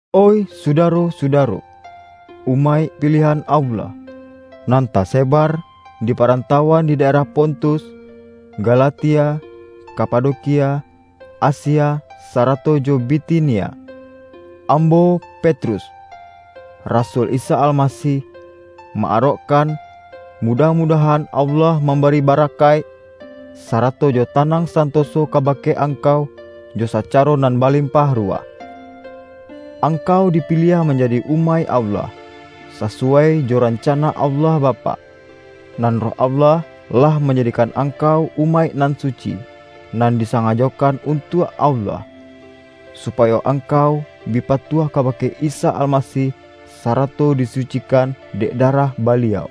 Oih sudaro-sudaro, umaik piliahan Allah, nan tasebar di parantauan di daerah Pontus, Ga-latia, Kapadokia, Asia, sarato jo Bitinia! Ambo, Petrus, rasul Isa Almasih, ma-arokkan, mudah-mu-dahan Allah mambari barakaik, sarato jo tanang santoso kabake angkau jo sacaro nan balimpah ruwah. Angkau dipiliah manjadi umaik Allah, sasuwai jo rancana Allah Bapak. Nan Roh Allah, lah manja-dikan angkau umaik nan suci, nan disangajokan untuak Allah, supa-yo angkau bi patuah kabake Isa Almasih, sarato disucikan dek da-rah Baliau.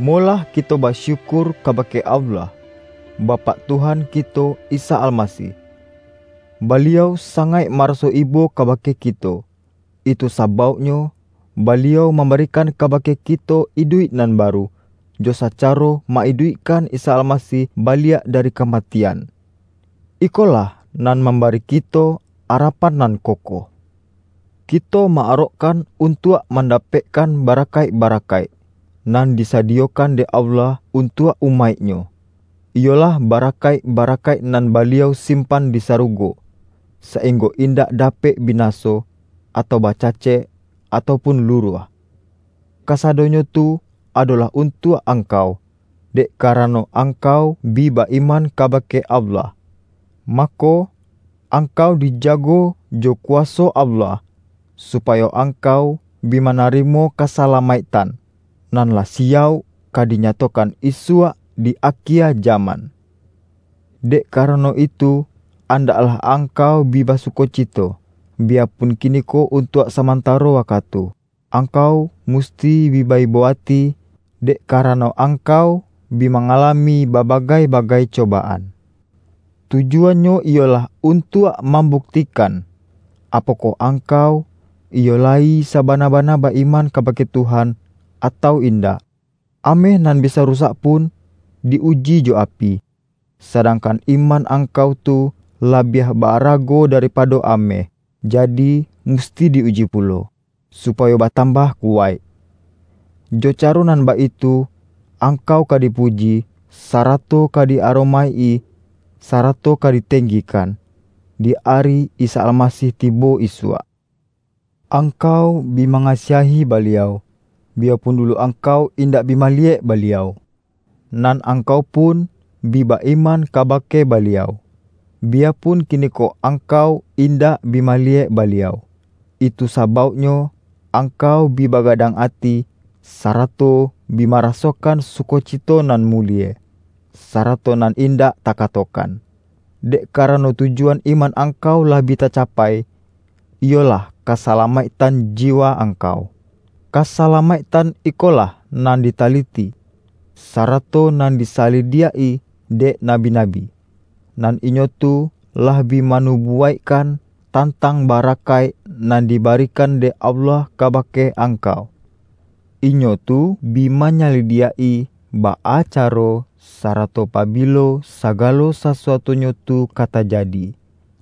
Molah kito basyukur kabake Allah, Bapak Tuhan kito Isa Almasih! Baliau sangaik maraso ibo kabake kito, itu sabauknyo Baliau mam-barikan kabake kito iduik nan baru, jo sacaro ma-iduikkan Isa Almasih baliak dari kamatian. Iko-lah nan mambari kito arapan nan kokoh. Kito ma-arokkan untuak mandapekkan barakaik-barakaik, nan disadiyokan dek Allah untuak umaik-Nyo, iyolah barakaik-bara-kaik nan Baliau simpan di sarugo, sainggo indak dapek binaso, atau bacacek, atau pun luruah. Kasa-donyo tu adolah untuak angkau, dek karano, angkau bi ba-iman ka-bake Allah. Mako, angkau dijago jo kuwaso Allah, supayo angkau bi manarimo kasalamaiktan, nan lah siyauk ka dinyatokan isuak di akie jaman. Dek karano itu, andaklah angkau bi basukocito, biyapun kiniko untuak samantaro wakatu, angkau musti bi ba-ibo ati, dek karano angkau bi ma-ngalami babagai-bagai cobaan. Tu-juannyo iyolah untuak mambuktikan, apokoh angkau iyo layi sabana-ba-na ba-iman kabake Tuhan, atau in-dak. Ameh nan bisa rusak pun, di-uji jo api. Sadangkan iman angkau tu labiah ba-arago daripado ameh, ja-di, musti di-uji pulo, supayo batam-bah kuwaik. Jo caro nan baitu, ang-kau ka dipuji, sarato ka di-aromaik-i, sarato ka ditenggikan, di ari Isa Almasih tibo isuak. Angkau bi ma-ngasiahi Baliau, biyapun dulu angkau indak bi maliyek Baliau. Nan angkau pun bi ba-iman kabake Baliau, biya-pun kiniko angkau indak bi maliyek Baliau. Itu sabauknyo angkau bi ba-gadang ati, sarato bi marasokan suko-cito nan mulie, sarato nan indak ta-katokan. Dek karano, tujuan iman angkau lah bi tacapai, iyolah kasala-maiktan jiwa angkau. Kasalamaiktan ikolah nan ditali-ti, sarato nan di salidiak-i dek nabi-nabi, nan inyo tu lah bi manubuwaik-kan, tantang barakaik nan dibarikan dek Allah kabake angkau. Inyo tu bi manyalidiak-i, baa caro, sarato pa-bilo sagalo sasuatunyo tu ka taja-di,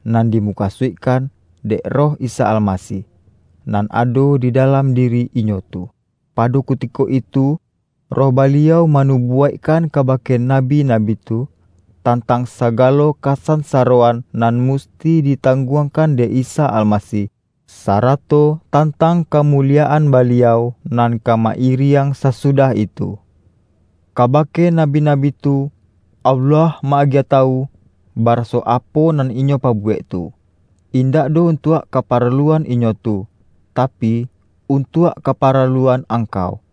nan dimukasuikkan dek Roh Isa Almasih, nan ado di dalam diri inyo tu. Pado kutiko itu, Roh Baliau manu-buwaikkan kabake nabi-nabi tu, tan-tang sagalo kasansaroan nan musti ditangguangkan dek Isa Almasih, sa-rato tantang kamuliyaan Baliau, nan ka ma-iriang sasudah itu. Kabake nabi-nabi tu Allah ma-agiah tawu, baraso apo nan inyo pabuwek tu, in-dak doh untuak kaparaluan inyo tu, tapi, untuak kaparaluan angkau,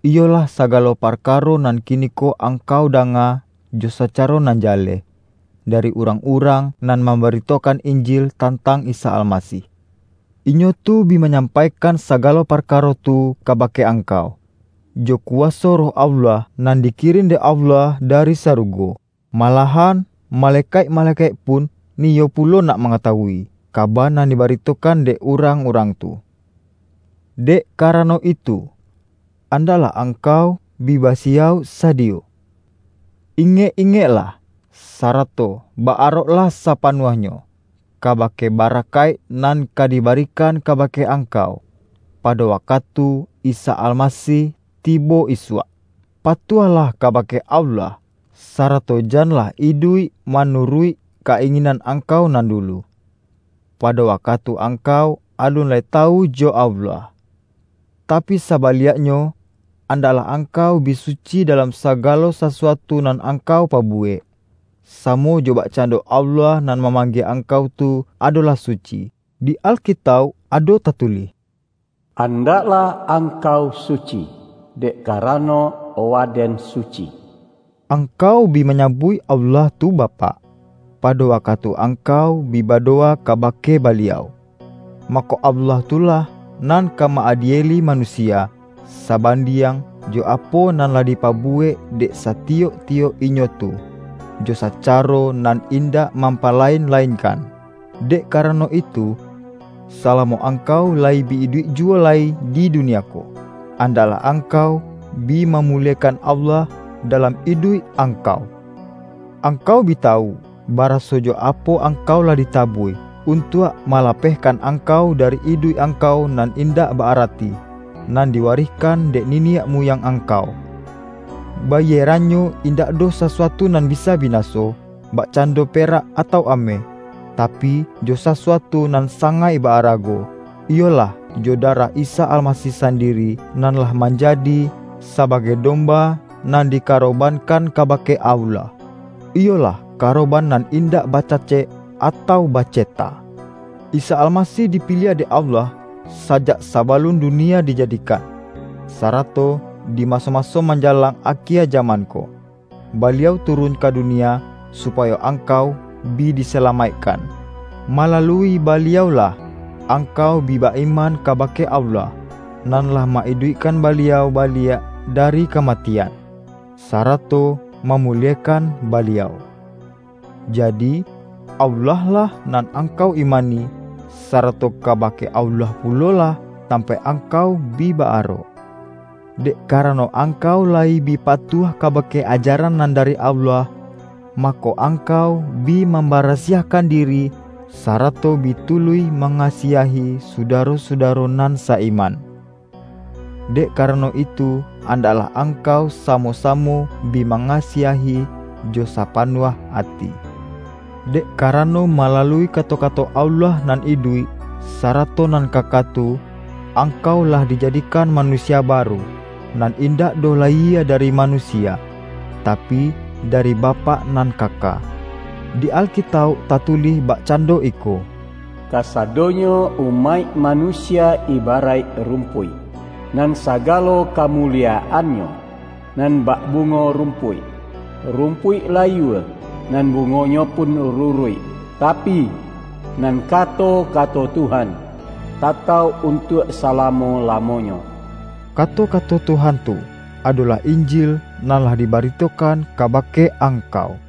iyo-lah sagalo parkaro nan kiniko ang-kau danga jo sacaro nan jaleh, dari urang-urang nan mambaritokan Injil tantang Isa Almasih. Inyo tu bi ma-nyampaikan sagalo parkaro tu kaba-ke angkau, jo kuwaso Roh Allah, nan dikirin dek Allah dari sarugo. Malah-an malekaik-malekaik pun niyo pulo nak mangatawui, kaba nan dibarito-kan dek urang-urang tu. Dek karano itu, andaklah ang-kau bi basiyauk-sadiyo. Ingek-ingek-lah, sarato ba-aroklah sapanuahnyo, kabake barakaik nan ka dibarikan kabake angkau, pado wakatu Isa Almasih tibo isuak. Patuahlah ka-bake Allah, sarato janlah iduik ma-nuruik ka-inginan angkau nan dulu, pado wakatu angkau alun lai tawu jo Allah. Tapi sabaliaknyo, andaklah angkau bi suci dalam sagalo sasuatu nan angkau pabuwek, samo jo bak-cando Allah nan mamanggie angkau tu adolah suci. Di Alkitauk ado ta-tulih,”Andaklah angkau suci, dek ka-rano Waden suci.” Angkau bi manyabuik Allah tu Bapak, pado wakatu angkau bi bado-wa kabake Baliau. Mako, Allah tu lah nan ka ma-adieli manusia, sabandiang jo apo nan lah dipabuwek dek sati-yok-tiyok inyo tu, jo sacaro nan indak mampalain-lainkan. Dek karano itu, salamo angkau layi bi iduik juwo lai di dunia ko, andaklah angkau bi ma-muliekan Allah dalam iduik angkau. Angkau bi tawu, baraso jo apo ang-kau lah ditabuih, untuak malapehkan angkau dari iduik angkau nan indak ba-arati, nan diwarihkan dek niniak muyang angkau. Bayierannyo indak doh sasuatu nan bisa binaso, bakcan-do perak atau ameh, tapi, jo sasuatu nan sangaik ba-arago; iyolah jo darah Isa Almasih sandiri, nan lah manjadi sabagai domba nan dikaro-bankan kabake Allah, iyolah karoban nan indak bacacek atau baceta. Isa Almasih dipiliah dek Allah sajak saba-lun dunia dijadikan. Sarato di maso-maso manjalang akie jaman ko, Ba-liau turun ka dunia, supayo angkau bi disalamaikkan. Malalui Baliau-lah angkau bi ba-iman kabake Allah, nan lah ma-iduikkan Baliau baliak dari kamatian, sarato mamuliekan Baliau. Jadi, Allah-lah nan angkau imani, sa-rato kabake Allah pulolah tampaik angkau bi ba-arok. Dek karano angkau layi bi patuah kabake ajaran nan dari Allah, mako, angkau bi mambarasiahkan diri, sa-rato bi tuluih mangasiahi sudaro-su-daro nan sa-iman. Dek karano itu, andaklah angkau samo-samo bi ma-ngasiahi jo sapanuah ati. Dek kara-no, malalui kato-kato Allah nan iduik, sarato nan kaka tu, angkau lah dija-dikan manusia baru, nan indak doh layie dari manusia, tapi, dari Bapak nan kaka. Di Alkitauk tatulih bak-cando iko,”Kasadonyo umaik manusia ibaraik rumpuik, nan sagalo kamuliyaannyo nan bak bungo rumpuik. Rumpuik layua, nan bungonyo pun ruruik. Tapi, nan kato-kato Tuhan, tatauk untuak salamo-lamonyo.” Kato-kato Tuhan tu, adolah Injil nan lah dibaritokan kabake angkau.